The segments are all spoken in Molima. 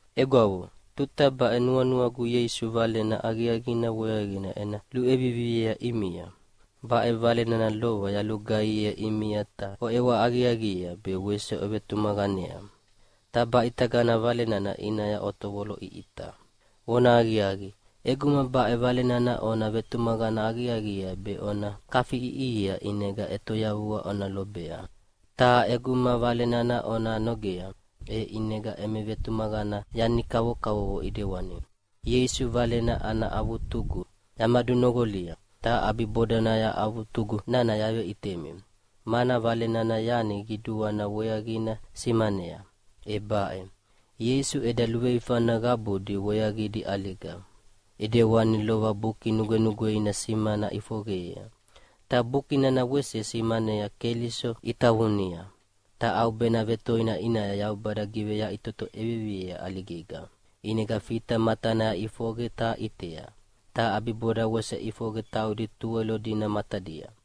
Egwavo, tuta baʼe nuanuagu Ieisu Valena Aqiaqina weaqina ena luʼeviviea ʼimia. Baʼe Vale nana lova yalugaihiea ʼimia ta oʼewa aqiaqiea be wese ovetumaqanea. Ta baʼitagana Vale nana ʼinaya otovoloʼiʼita. Vonahaqiaqi, ʼeguma baʼe Vale nana ona vetumaqana aqiaqiea be ona kafiʼiʼihia ʼinega ʼetoyavua ona lobea. Ta ʼeguma Vale nana ona nogea, e ʼinega emi vetumaqana yani kavokavovo ʼidewani. Ieisu Valena ana avutugu yamadunoqolia, ta ʼabibodanaya avutugu nana yaveʼitemi, mana Vale nana yani qiduana weaqina simanea, e baʼe: Ieisu eda luveifana qabudi weaqidi ʼaliga, ʼidewani lova Buki Nugwenugweina simana ʼifoqeyea. Ta Buki nana wese simanayea Keliso itavunia, ta ʼaubena vetoina ʼinaya Yaubada giveyaʼitoto ʼeviviea ʼaligega, ʼinega Fita matanaya ʼifoqe ta ʼitea, ta ʼabiboda wese ʼifoqe taudi Tuwelo dina matadia.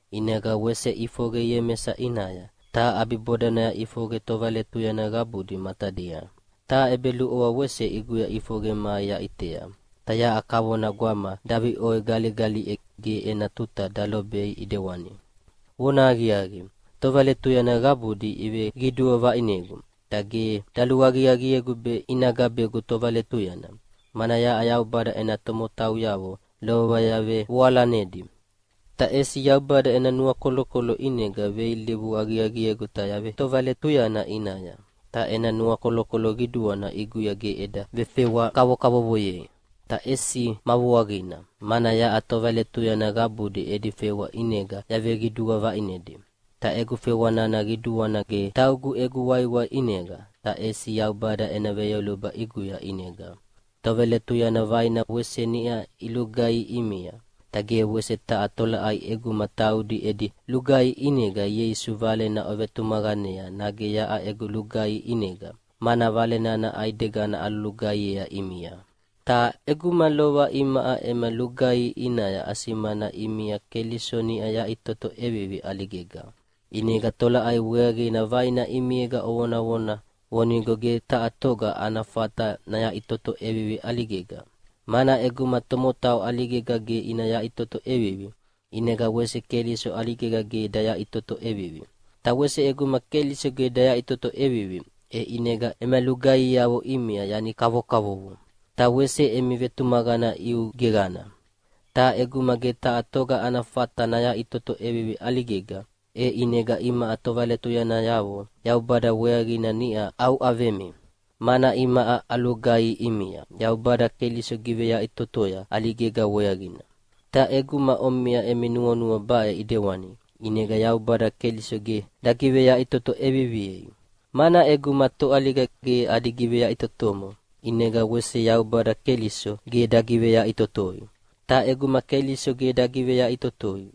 ʼInega wese ʼifoqe Iemesa ʼinaya, ta ʼabibodanaya ʼifoqe tovaletuyana qabudi matadia. Ta ʼebeluʼovoa wese ʼiguya ʼifoqe mai yaʼitea. Ta yaʼa kavona gwama daviʼoi galigaliʼe ge ena tuta dalobei ʼidewani. Vonahaqiaqi, tovaletuyana qabudi iveqidua vaʼinegu, ta ge daluaqiaqiegu be ina gabegu tovaletuyana, mana yaʼa Yaubada ena tomotauyavo lova yavevoalanedi. Ta ʼesi Yaubada ena nuakolokolo ʼinega veilivu aqiaqiegu ta yavetovaletuyana ʼinaya. Ta ena nuakolokolo qiduana ʼiguya ge eda vefewa kavokavovoyei. Ta ʼesi ma vuaqina, mana yaʼa tovaletuyana qabudi edi fewa ʼinega yaveqidua vaʼinedi. Ta egu fewa nana qiduana ge taugu egu waiwai ʼinega, ta ʼesi Yaubada ena veyoluba ʼiguya ʼinega. Tovaletuyana vaina wese niʼa ilugaihi ʼimia. Ta ge wese taha tolaʼai ʼeguma taudi edi lugaihi ʼinega Ieisu Valena ovetumaqanea nage yaʼa egu lugaihi ʼinega, mana Vale nana ʼaidegana alugaihiea ʼimia. Ta ʼeguma lova imaʼa ema lugaihi ʼinaya asimana ʼimia Keliso niʼa yaʼitoto ʼevivi ʼaligega, ʼinega tolaʼai weaqina vaina ʼimiega ovonavona vonigo ge taha toga ana fata nayaʼitoto ʼevivi ʼaligega? Mana ʼeguma tomotau ʼaligega ge ina yaʼitoto ʼevivi, ʼinega wese Keliso ʼaligega ge dayaʼitoto ʼevivi. Ta wese ʼeguma Keliso ge dayaʼitoto ʼevivi, e ʼinega ema lugaihiavo ʼimia yani kavokavovo, ta wese emi vetumaqana ʼiu geqana. Ta ʼeguma ge taha toga ana fata nayaʼitoto ʼevivi ʼaligega, e ʼinega imaʼa tovaletuyanayavo Yaubada weaqina niʼa auʼavemi, mana imaʼa alugaihi ʼimia Yaubada Keliso giveyaʼitotoya ʼaligega weaqina. Ta ʼeguma omiʼa emi nuanua baʼe ʼidewani, ʼinega Yaubada Keliso ge dagiveyaʼitoto ʼeviviei. Mana ʼeguma toʼaliga ge adi giveyaʼitotomo, ʼinega wese Yaubada Keliso ge dagiveyaʼitotoi. Ta ʼeguma Keliso ge dagiveyaʼitotoi,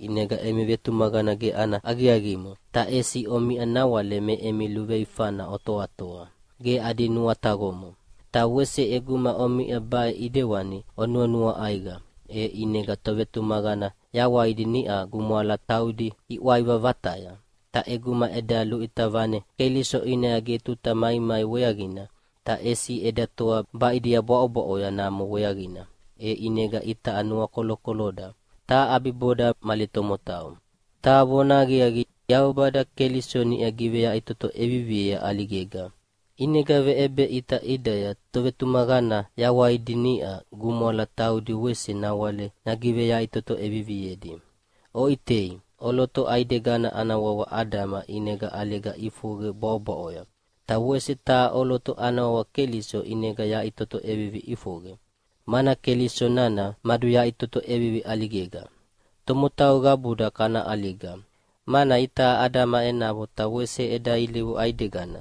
ʼinega emi vetumaqana ge ana aqiaqimo, ta ʼesi omiʼa nawale me emi luveifana otoatoa, ge adi nuataqomo. Ta wese ʼeguma omiʼa baʼe ʼidewani onuanua ʼaiqa, e ʼinega tovetumaqana yawaidi niʼa gumwala taudi iʼwaiva vataya. Ta ʼeguma eda luʼita vane Keliso ʼinaya ge tuta maimai weaqina, ta ʼesi eda toa baʼidia bwaʼobwaʼoya namo weaqina, e ʼinega itaʼa nuakolokoloda, ta ʼabiboda mali tomotau. Ta vonahaqiaqi, Yaubada Keliso niʼa giveyaʼitoto ʼeviviea ʼaligega! ʼInega veʼebeʼita ʼidaya tovetumaqana yawaidi niʼa gumwala taudi wese nawale nagiveyaʼitoto ʼeviviedi. Oʼitei, ʼoloto ʼaidegana ana wawa Adama ʼinega ʼaliga ʼifoqe bwaʼobwaʼoya, ta wese taha ʼoloto ana wawa Keliso ʼinega yaʼitoto ʼevivi ʼifoqe, mana Keliso nana maduyaʼitoto ʼevivi ʼaligega. Tomotau qabuda kana ʼaliga, mana itaʼa Adama enavo ta wese eda ilivu ʼaidegana.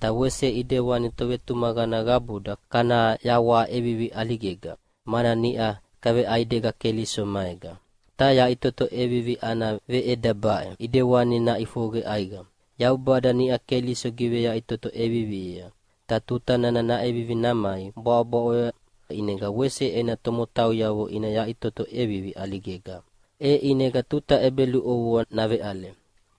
Ta wese ʼidewani tovetumaqana qabuda kana yawaha ʼevivi ʼaligega, mana niʼa kaveʼaidega Keliso maega. Ta yaʼitoto ʼevivi ana veʼeda baʼe ʼidewani naʼifoqe ʼaiqa: Yaubada niʼa Keliso giveyaʼitoto ʼeviviea, ta tuta nana naʼevivi namai bwaʼobwaʼoya ʼinega wese ena tomotauyavo ina yaʼitoto ʼevivi ʼaligega. E ʼinega tuta ʼebeluʼovoa naveʼale.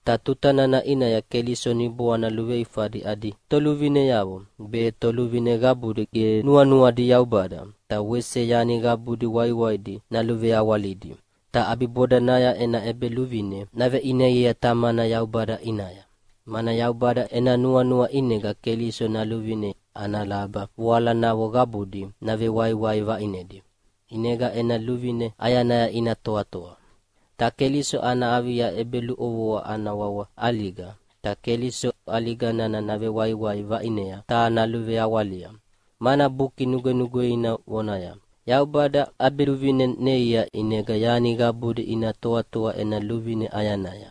Ta tuta nana ʼinaya Keliso niboana luveifadi adi toluvineavo be, toluvine qabudi ge nuanuadi Yaubada, ta wese yani qabudi waiwaidi naluveawalidi. Ta ʼabibodanaya ena ʼEbeluvine naveʼineiea Tamana Yaubada ʼinaya. Mana Yaubada ena nuanua ʼinega Keliso naluvine ana laba voalanavo qabudi navewaiwai vaʼinedi, ʼinega ena luvine ʼayanaya ina toatoa. Ta Keliso ana avia ʼebeluʼovoa ana wawa ʼaliga, ta Keliso ʼaliga nana navewaiwai vaʼinei ta naluveawalia. Mana Buki Nugwenugweina vonaya, “Yaubada ʼabiluvine neia ʼinega yani qabudi ina toatoa ena luvine ʼayanaya.”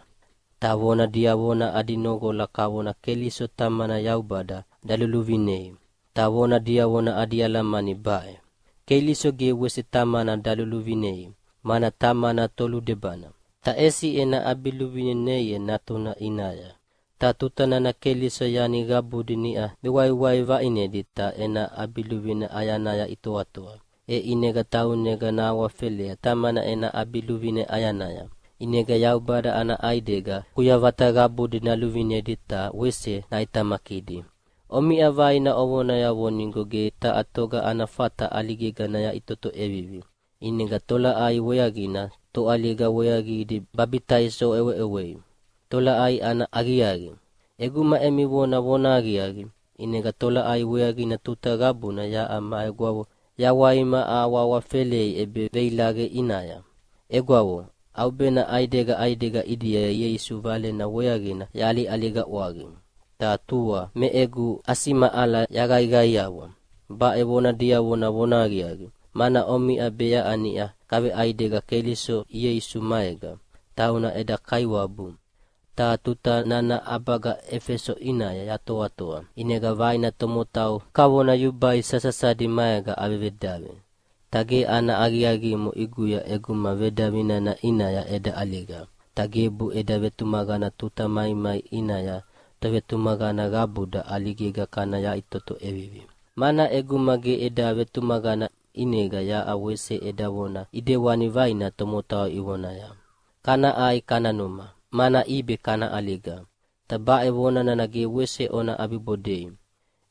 Ta vona diavona adi noqola kavona Keliso Tamana Yaubada daluluvinei. Ta vona diavona adi alamani baʼe: Keliso ge wese Tamana daluvinei, mana Tamana toludebana, ta ʼesi ena ʼabiluvine neia Natuna ʼinaya. Ta tuta nana Keliso yani qabudi niʼa vewaiwai vaʼinedi ta ena ʼabiluvine ʼayanaya itoatoa, e ʼinega taunega nahawafelea Tamana ena ʼabiluvine ʼayanaya. ʼInega Yaubada ana ʼaidega kuyavata qabudi naluvinedi ta wese naʼitamakidi. Omiʼa vaina ovonaya vonigo ge taha toga ana fata ʼaligega nayaʼitoto ʼevivi. ʼInega tolaʼai weaqina toʼaliga weaqidi babitaiso oʼeweʼewei? Tolaʼai ana aqiaqi? ʼEguma emi vona vonahaqiaqi, ʼinega tolaʼai weaqina tuta qabuna yaʼa ma egwavo yawaima ahawahawafelei ʼebeveilaqe ʼinaya? Egwavo, ʼaubena ʼaidega ʼaidega ʼidia Ieisu Valena weaqina yaʼaliʼaliga ʼwaqi. Ta tua me egu ʼasimaʼala yaqaiqaiawa. Baʼe vona diavona vonahaqiaqi, mana omiʼa be yaʼa niʼa kaveʼaidega Keliso Ieisu maega, tauna eda Kaiwabu. Ta tuta nana ʼabaga Efeso ʼinaya yatoatoa, ʼinega vaina tomotau kavona yubai sasasadi maega avevedavi. Ta ge ana aqiaqimo ʼiguya ʼeguma vedavi nana ʼinaya eda ʼaliga, ta gebu eda vetumaqana tuta maimai ʼinaya tovetumaqana qabuda ʼaligega kana yaʼitoto ʼevivi. Mana ʼeguma ge eda vetumaqana ʼinega yaʼa wese eda vona ʼidewani vaina tomotau ivonaya, “Kana ʼai kana numa, mana ʼibe kana ʼaliga.” Ta baʼe vona nana ge wese ona ʼabibodei.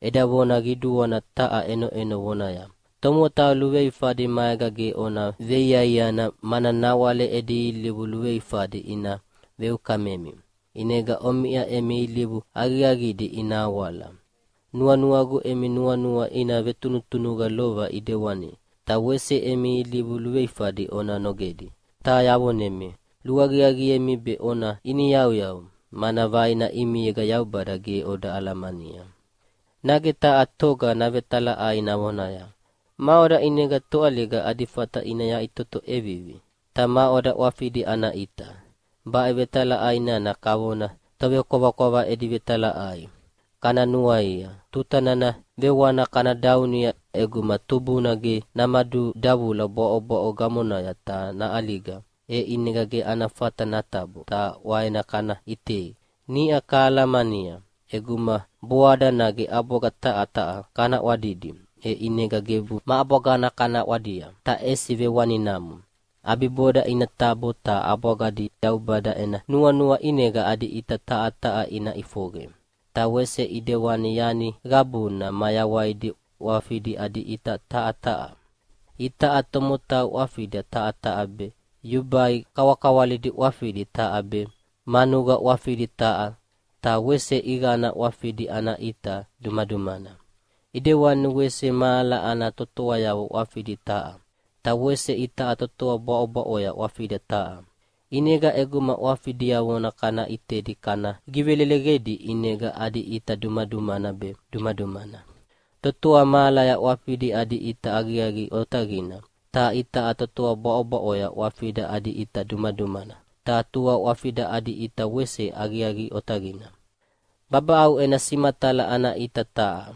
Eda vona qiduana taha ʼenoʼeno vonaya, “Tomotau luveifadi maega ge ona veiaiana, mana nawale edi ilivu luveifadi ina veukamemi, ʼinega omiʼa emi ilivu aqiaqidi ina awala.” Nuanuagu emi nuanua ina vetunutunuqa lova ʼidewani, ta wese emi ilivu luveifadi ona nogedi. Ta yavonemi, luaqiaqiemi be ona iniyauyau, mana vaina ʼimiega Yaubada ge oda alamania. Nage taha toga navetalaʼai navonaya, “Maʼoda ʼinega toʼaliga adi fata ina yaʼitoto ʼevivi? Ta maʼoda ʼwafidi ana ʼita?” Baʼe vetalaʼai nana kavona tovekwavakwava edi vetalaʼai. Kana nuaia, tuta nana vewana kana daunia ʼeguma tubuna ge namadudavula bwaʼobwaʼo gamonaya ta naʼaliga, e ʼinega ge ana fata natabo ta ʼwaena kana ʼitei. Niʼa kahalamania, ʼeguma boada nage ʼabwaga taha taha kana ʼwadidi, e ʼinega gebu ma ʼabwagana kana ʼwadia, ta ʼesi vewaninamo. ʼAbiboda ina tabo ta ʼabwagadi Yaubada ena nuanua ʼinega adi ʼita taha taha ina ʼifoqe. Ta wese ʼidewani yani qabuna mayawaidi ʼwafidi adi ʼita taha taha. Itaʼa tomotau ʼwafida taha be, yubai kawakawalidi ʼwafidi taha be, manuqa ʼwafidi taha, ta wese ʼiqana ʼwafidi ana ʼita dumadumana. ʼIdewani wese mahala ana totoayavo ʼwafidi taha. Ta wese itaʼa totoa bwaʼobwaʼoya ʼwafida taha. ʼInega ʼeguma ʼwafi diavona kana ʼitedi kana giveleleqedi ʼinega adi ʼita dumadumana be dumadumana. Totoa mahalaya ʼwafidi adi ʼita aqiaqi otaqina, ta itaʼa totoa bwaʼobwaʼoya ʼwafida adi ʼita dumadumana, ta tua ʼwafida adi ʼita wese aqiaqi otaqina. Babaʼau ena simatala ana ʼita taha,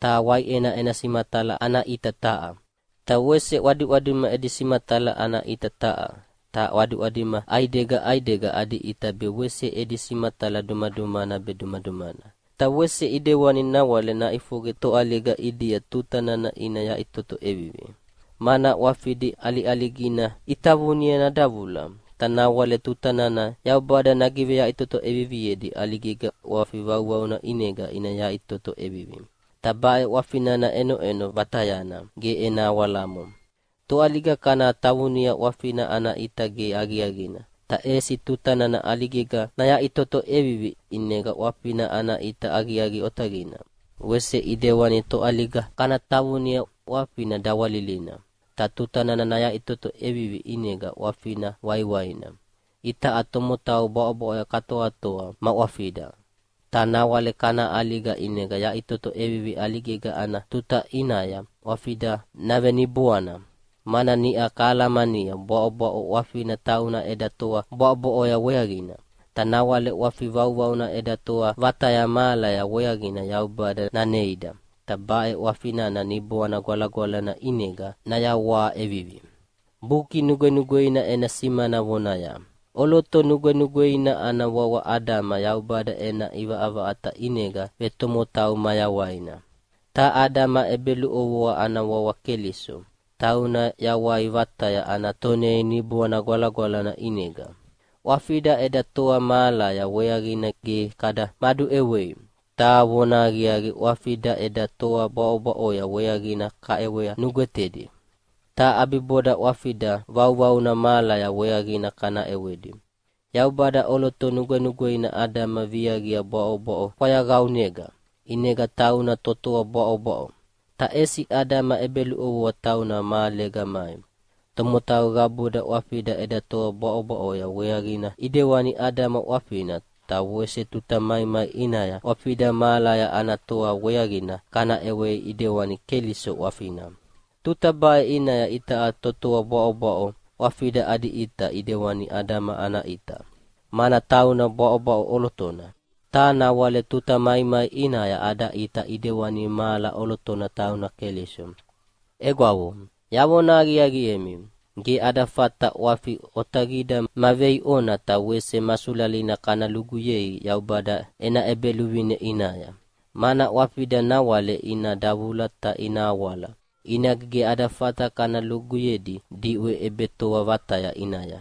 ta waiʼena ena simatala ana ʼita taha, ta wese ʼwadiʼwadima edi simatala ana ʼita taha. Ta ʼwadiʼwadima ʼaidega ʼaidega adi ʼita be wese edi simatala dumadumana be dumadumana. Ta wese ʼidewani nawale naʼifoqe toʼaliga ʼidia tuta nana ina yaʼitoto ʼevivi. Mana ʼwafidi ʼaliʼaligina itavunia nadavula, ta nawale tuta nana Yaubada nagiveyaʼitoto ʼeviviedi ʼaligega ʼwafi vauvauna ʼinega ina yaʼitoto ʼevivi. Ta baʼe ʼwafi nana ʼenoʼeno vatayana, ge ena awalamo. Toʼaliga kana tavunia ʼwafina ana ʼita ge aqiaqina, ta ʼesi tuta nana ʼaligega nayaʼitoto ʼevivi ʼinega ʼwafina ana ʼita aqiaqi otaqina. Wese ʼidewani toʼaliga kana tavunia ʼwafina dawalilina, ta tuta nana nayaʼitoto ʼevivi ʼinega ʼwafina waiwaina. Itaʼa tomotau bwaʼobwaʼoya katoatoa ma ʼwafida. Ta nawale kana ʼaliga, ʼinega yaʼitoto ʼevivi ʼaligega ana tuta ʼinaya ʼwafida naveniboana. Mana niʼa kahalamania bwaʼobwaʼo ʼwafina tauna eda toa bwaʼobwaʼoya weaqina. Ta nawale ʼwafi vauvauna eda toa vataya mahalaya weaqina Yaubada naneida, ta baʼe ʼwafi nana Niboana Gwalagwalana ʼinega nayawaha ʼevivi. Buki Nugwenugweina ena simana vonaya, “ʼOloto nugwenugweina ana wawa Adama Yaubada ena ʼivaʼavaʼata ʼinega vetomotau mayawaina”, ta Adama ʼebeluʼovoa ana wawa Keliso, tauna yawai vataya ana tonei Niboana Gwalagwalana ʼinega. ʼWafida eda toa mahalaya weaqina ge kada maduʼewei, ta vonahaqiaqi ʼwafida eda toa bwaʼobwaʼoya weaqina kaʼewa nugwetedi, ta ʼabiboda ʼwafida vauvauna mahala weaqina kana ʼewedi. Yaubada ʼoloto nugwenugweina Adama viaqia bwaʼobwaʼo fwayaqaunega, ʼinega tauna totoa bwaʼobwaʼo. Ta ʼesi Adama ʼebeluʼovoa tauna mahalega mai. Tomotau qabuda ʼwafida eda toa bwaʼobwaʼoya weaqina ʼidewani Adama ʼwafina. Ta wese tuta maimai ʼinaya ʼwafida mahala ana toa weaqina kana ʼewea ʼidewani Keliso ʼwafina. Tuta baʼe ʼinaya itaʼa totoa bwaʼobwaʼo ʼwafida adi ʼita ʼidewani Adama ana ʼita, mana tauna bwaʼobwaʼo ʼolotona. Ta nawale tuta maimai ʼinaya ada ʼita ʼidewani mahala ʼolotona tauna Keliso. Egwavo, yavona aqiaqiemi, ge ada fata ʼwafi otaqida ma veiʼona ta wese ma sulalina kana luguyei Yaubada ena ʼEbeluvine ʼinaya. Mana ʼwafida nawale ina davula ta ina awala, ʼinega ge ada fata kana luguyedi diʼwe ʼebetoa vataya ʼinaya.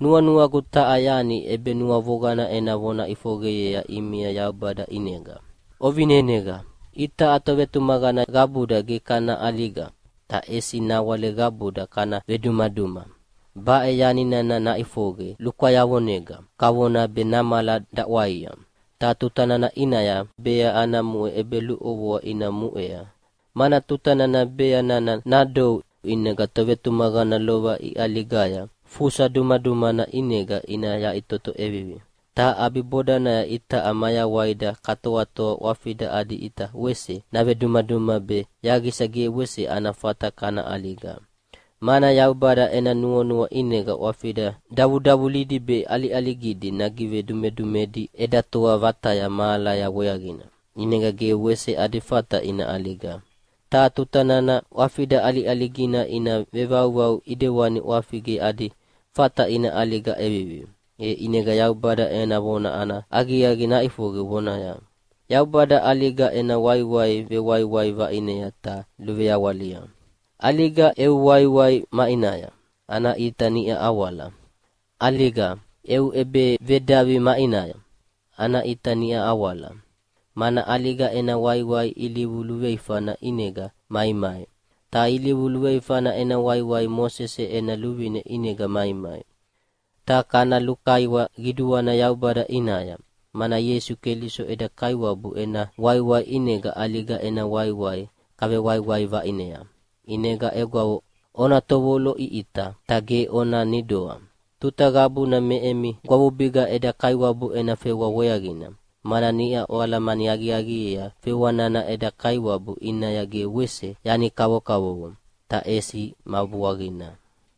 Nuanuagu taha yani ʼebenuavoqana ena vona ʼifoqeyea ʼimia Yaubada ʼinega. Ovineneqa! Itaʼa tovetumaqana qabuda ge kana ʼaliga, ta ʼesi nawale qabuda kana vedumaduma. Baʼe yani nana naʼifoqe lukwayavonega, kavona be namala daʼwaia. Ta tuta nana ʼinaya bea ana muʼe ʼebeluʼovoa ina muʼea. Mana tuta nana bea nana nadou ʼinega tovetumaqana lova iʼaligaya fusa dumadumana ʼinega ina yaʼitoto ʼevivi. Ta ʼabibodanaya itaʼa mayawaida katoatoa ʼwafida adi ʼita wese navedumaduma be yaqisa ge wese ana fata kana ʼaliga. Mana Yaubada ena nuanua ʼinega ʼwafida davudavulidi be ʼaliʼaligidi nagivedumedumedi eda toa vataya mahalaya weaqina, ʼinega ge wese adi fata ina ʼaliga. Ta tuta nana ʼwafida ʼaliʼaligina ina vevauvau ʼidewani ʼwafi ge adi fata ina ʼaliga ʼevivi, e ʼinega Yaubada ena vona ana aqiaqi naʼifoqe vonaya, “Yaubada ʼaliga ena waiwai vewaiwai vaʼinea ta luveawalia!” “ʼAliga, eu waiwai maʼinaya? Ana ʼita niʼa awala. ʼAliga, eu ʼebevedavi maʼinaya? Ana ʼita niʼa awala!” Mana ʼaliga ena waiwai ilivu luveifana ʼinega maimai, ta ilivu luveifana ena waiwai Mosese ena luvine ʼinega maimai. Ta kana lukaiwa qiduana Yaubada ʼinaya, mana Ieisu Keliso eda Kaiwabu ena waiwai ʼinega ʼaliga ena waiwai kavewaiwai vaʼinea. ʼInega egwavo, ona tovoloʼiʼita ta ge ona nidoa. Tuta qabuna me emi gwavubiga eda Kaiwabu ena fewa weaqina, mana niʼa oalamani aqiaqiea fewa nana eda Kaiwabu ʼinaya ge wese yani kavokavovo, ta ʼesi ma vuaqina.